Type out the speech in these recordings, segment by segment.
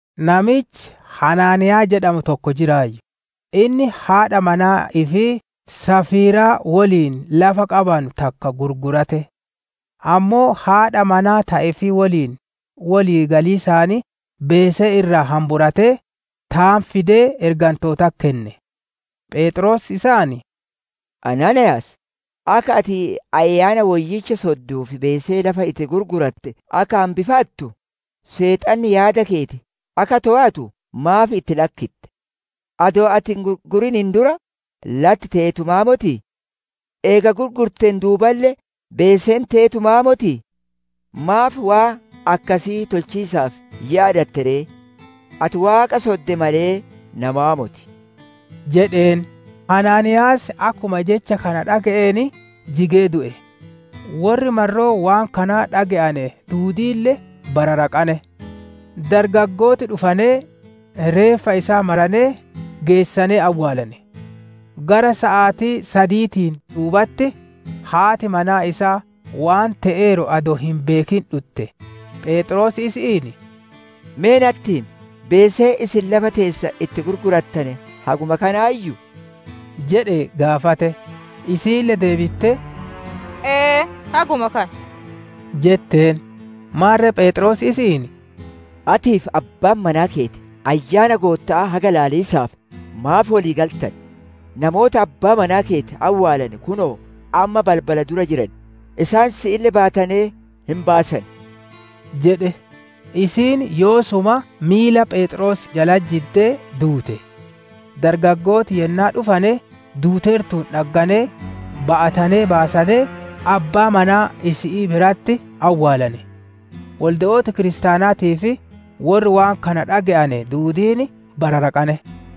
Namichi Anaaniyaa jedhamu tokko jiraayyu; inni haadha manaa ifii Safiiraa woliin lafa qabanu takka gurgurate. Ammoo haadha manaa ta ifii woliin wolii galiisaan beesee irraa hamburatee, taan fidee ergantootatti kenne. Pheexroos isaan, «Anaaniiyaas! Akka ati Ayyaana Woyyicha sodduu fi beesee lafa itti gurguratte akka hambifattu, seexanni yaada keeti akka toowatu maaf itti lakkitte? Adoo ati hin gurgurin dura, latti teetumaa motii? Eega gurgurteen duuballe beeseen teetumaa motii? Maaf waan akkasii tolchiisaaf yaadatte ree? Ati Waaqa sodde malee, namaa moti» jedheen. Anaaniiyaas akkuma jecha kana dhage'een, jigee du'e; worri marroo waan kanaa dhage'ane duudiille bararaqane. Dargaggooti dhufanee, reeffa isaa maranee, geessanee awwaalane. Gara saatii sadiitiin duubatti, haati manaa isaa waan te'eeru adoo hin beekin dhutte. Pheexroos isi'iin, «Me natti himi, beeseen isin lafa teessan itti gurgurattane haguma kanaayyuu?» jedhee gaafate; Isiille deebittee, «Eeti, haguma kana» jetteen. Maarre Pheexroos isi'iin, «Atii fi Abbaan manaa keeti Ayyaana Gootta'aa haga ilaaliisaaf maaf wolii galtane? Namooti Abbaa manaa keeti awwaalane kunoo ammaa balbala dura jiran, isaan si'ille ba'atanee hin baasan» jedhe. Isiin yoosuma miila Pheexroosii jalatti jiddee duute. Dargaggooti yennaa dhufane duuteertuun dhagganee, ba'atanee baasanee abbaa manaa isi'ii biratti awwaalane. Wolde'ooti kiristaanaatii fi worri waan kana dhage'ane duudiin bararaqane.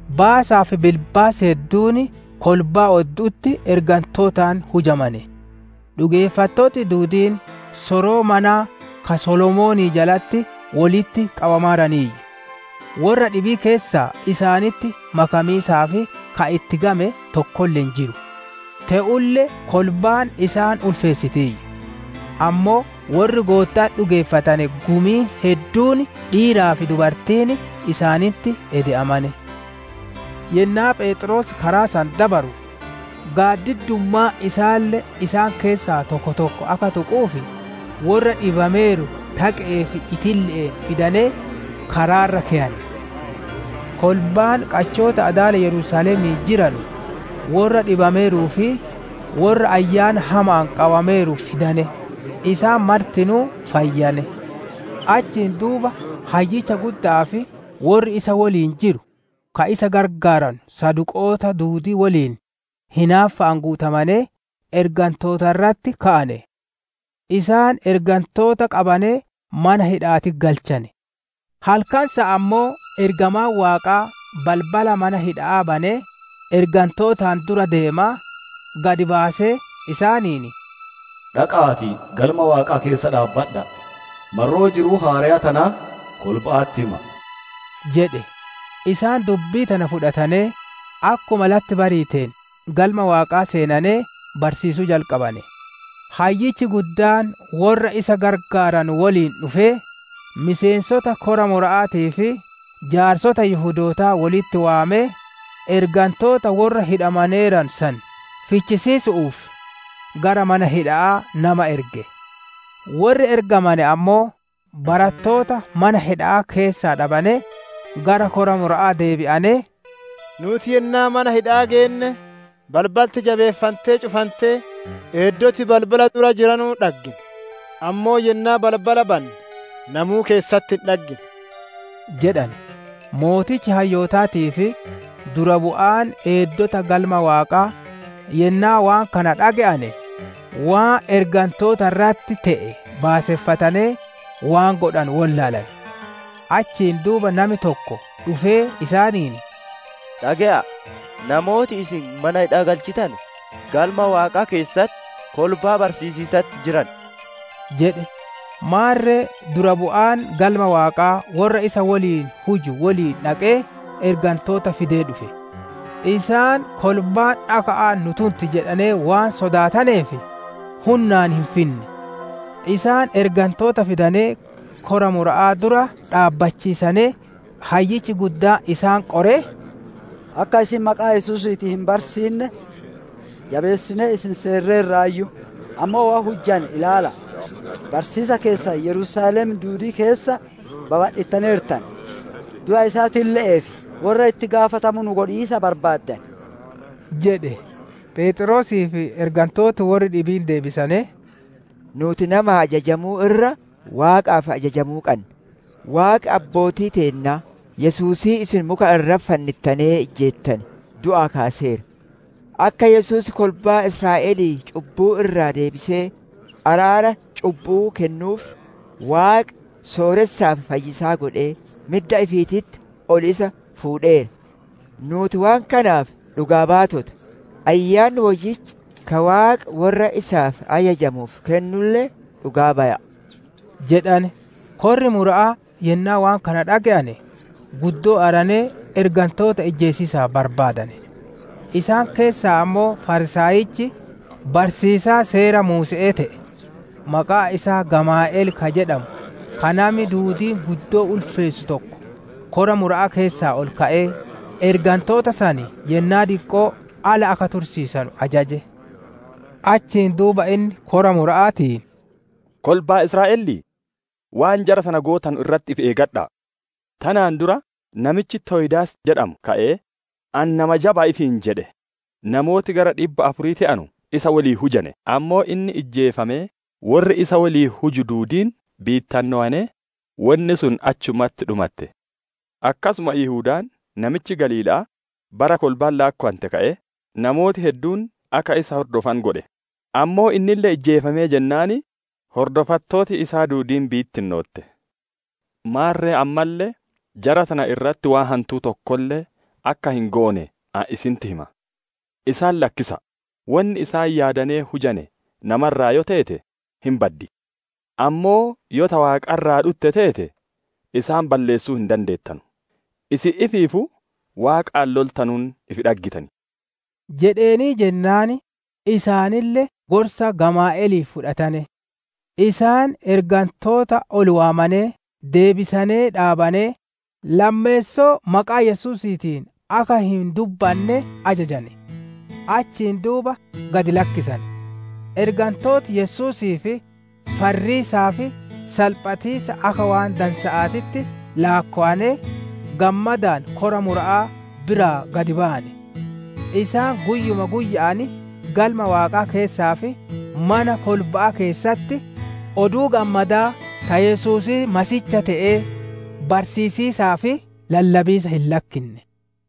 Baasaa fi bilbaasi hedduun kolbaa oddu'utti ergantootaan hujamane. Dhugeeffattooti duudiin soroo manaa ka Solomoonii jalatti wolitti qabamaniiyyu. Worra dhibii keessaa isaanitti makamiisaaf ka itti game tokkolle hin jiru; te'ulle kolbaan isaan ulfeessitiiyyu. Ammoo worri Gootta'atti dhugeeffatane gumiin hedduun dhiiraa fi dubartiin isaanitti ede'amane. Yennaa Pheexroos karaa san dabaru gaaddiddummaan isaalle isaan keessaa tokko tokko akka tuxxuuf, worra dhibameeru taqe'ee fi itille'een fidanee karaa irra keyane. Kolbaan qachoota adaala Yerusaalemii jiranu, worra dhibameeruu fi worra ayyaana hama'aan qabameeru fidane; isaan martinuu fayyane. Achiin duuba Hayyichi gudda'aa fi worri isa woliin jiru, ka isa gargaaranu saduqoota duudii woliin hinaaffa'aan guutamanee ergantoota irratti ka'ane. Isaan ergantoota qabanee mana hidha'aatitti galchane. Halkan san ammoo ergamaan Waaqaa balbala mana hidha'aa banee, ergantootaan dura deemaa, gad baasee, isaaniin, «Dhaqa'aatii Galma Waaqaa keessa dhaabbadha'aa, marroo jiruu haareya tanaa, kolba'atti hima'a» jedhe. Isaan dubbii tana fudhatanee, akkuma latti bariiteen Galma Waaqaa seenanee barsiisuu jalqabane. Hayyichi guddaan worra isa gargaaranu woliin dhufee, miseensota kora mura'aatii fi jaarsota Yihudootaa wolitti waamee, ergantoota worra hidhamaneeranu san fichisiisu'uuf gara mana hidha'aa nama erge. Worri ergamane ammoo, barattoota mana hidha'aa keessaa dhabanee, gara Kora Mura'aa deebi'anee, «Nuuti yennaa mana hidha'aa geenne, balbalti jabeeffantee cufantee, eeddoti balbala dura jiranuun dhaggine; ammoo yennaa balbala banne, namuu keessatti hin dhaggine» jedhane. Sooreyyiin hayyootaatii fi dura bu'aan eeddota Galma Waaqaa yennaa waan kana dhage'ane, waan ergantoota irratti te'e baaseffatanee, waan godhanu wollaalane. Achiin duuba nami tokko dhufee isaaniin, «Dhage'a'a! Namooti isin mana hidha'aa galchitane Galma Waaqaa keessatti, kolbaa barsiisiisatti jiran!» jedhe. Maarre dura bu'aan Galma Waaqaa worra isa woliin huju woliin dhaqee ergantoota fidee dhufe. Isaan kolbaan dhaka'aan nu tunti jedhanee waan sodaataneef, hunnaan hin finne. Isaan ergantoota fidanee, Kora Mura'aa dura dhaabbachiisanee, hayyichi guddaan isaan qoree, «Akka isin maqaa Yesuusiitiin hin barsiinne, jabeessinee isin seerreerraayyu, ammoo waan hujjane ilaala'a! Barsiisa keessan Yerusaalem duudii keessa babadhittaneertan; du'a isaatille'eef worra itti gaafatamu nu godhiisa barbaaddan» jedhe. Pheexroosii fi ergantooti worri dhibiin deebisanee, «Nuuti namaaf ajajamuu irra, Waaqaaf ajajamuu qanna. Waaqi Abbootii teennaa, Yesuusii isin muka irratti fannittanee ijjeettane du'aa kaaseera. Akka Yesuus kolbaa Israa'elii cubbuu irraa deebisee araara cubbu'uu kennuuf, Waaqi sooressaa fi fayyisaa godhee midda ifiititti ol isa fuudheera. Nuuti waan kanaaf dhugaa baatota; Ayyaanni Woyyichi, ka Waaqi worra isaaf ajajamuuf kennulle dhugaa baya'a» jedhane. Korri Mura'aa yennaa waan kana dhage'ane, guddoo aaranee ergantoota ijjeesiisa barbaadane. Isaan keessaa ammoo Fariisaayichi, barsiisaa Seera Muuse'ee te'e, maqaan isaa Gamaali'el ka jedhamu, ka nami duudiin guddoo ulfeessu tokko, Kora Mura'aa keessaa ol ka'ee, ergantoota san yennaa diqqoo ala akka tursiisanu ajaje. Achiin duuba inni kora Mura'aatiin, «Kolbaa Israa'elii! Waan jara tana gootanu irratti ifi eegadha'a. Tanaan dura namichi Toyidaas jedhamu ka'ee, ani nama jaba'a ifiin jedhe; namooti gara dhibba afurii te'anu isa woliin hujane. Ammoo inni ijjeefamee, worri isa woliin huju duudiin bittinnowanee, wonni sun achumatti dhumatte. Akkasuma Yihudaan namichi Galiila'aa, bara kolbaan laakkowante ka'ee, namooti hedduun akka isa hordofanu godhe, ammoo innille ijjeefamee jennaan, hordofattooti isaa duudiin bittinnootte. Maarre ammalle, jara tana irratti waan hantuu tokkolle akka hin goone ani isinitti hima. Isaan lakkisa'a! Wonni isaan yaadanee hujane nama irraa yoo teete, hin baddi; ammoo yoo ta Waaqa irraa dhutte teete, isaan balleessuu hin dandeettanu; isin ifiifuu Waaqaan loltanuun ifi dhaggitan» jedheenii jennaan, isaanille gorsa Gamaali'elii fudhatane. Isaan ergantoota ol waamanee deebisanee, dhaananee, lammeessoo maqaa Yesuusiitiin akka hin dubbanne ajajane; achiin duuba gad lakkisane. Ergantooti Yesuusiif farriisaa fi salphatiisa akka waan dansa'aatitti laakkowanee, gammadaan Kora Mura'aa biraa gad bayane. Isaan guyyuma guyya'aan Galma Waaqaa keessaa fi mana kolba'aa keessatti, Oduu Gammadaa ta Yesuusii Masiihiicha te'ee, barsiisiisaa fi lallabiisa hin lakkinne.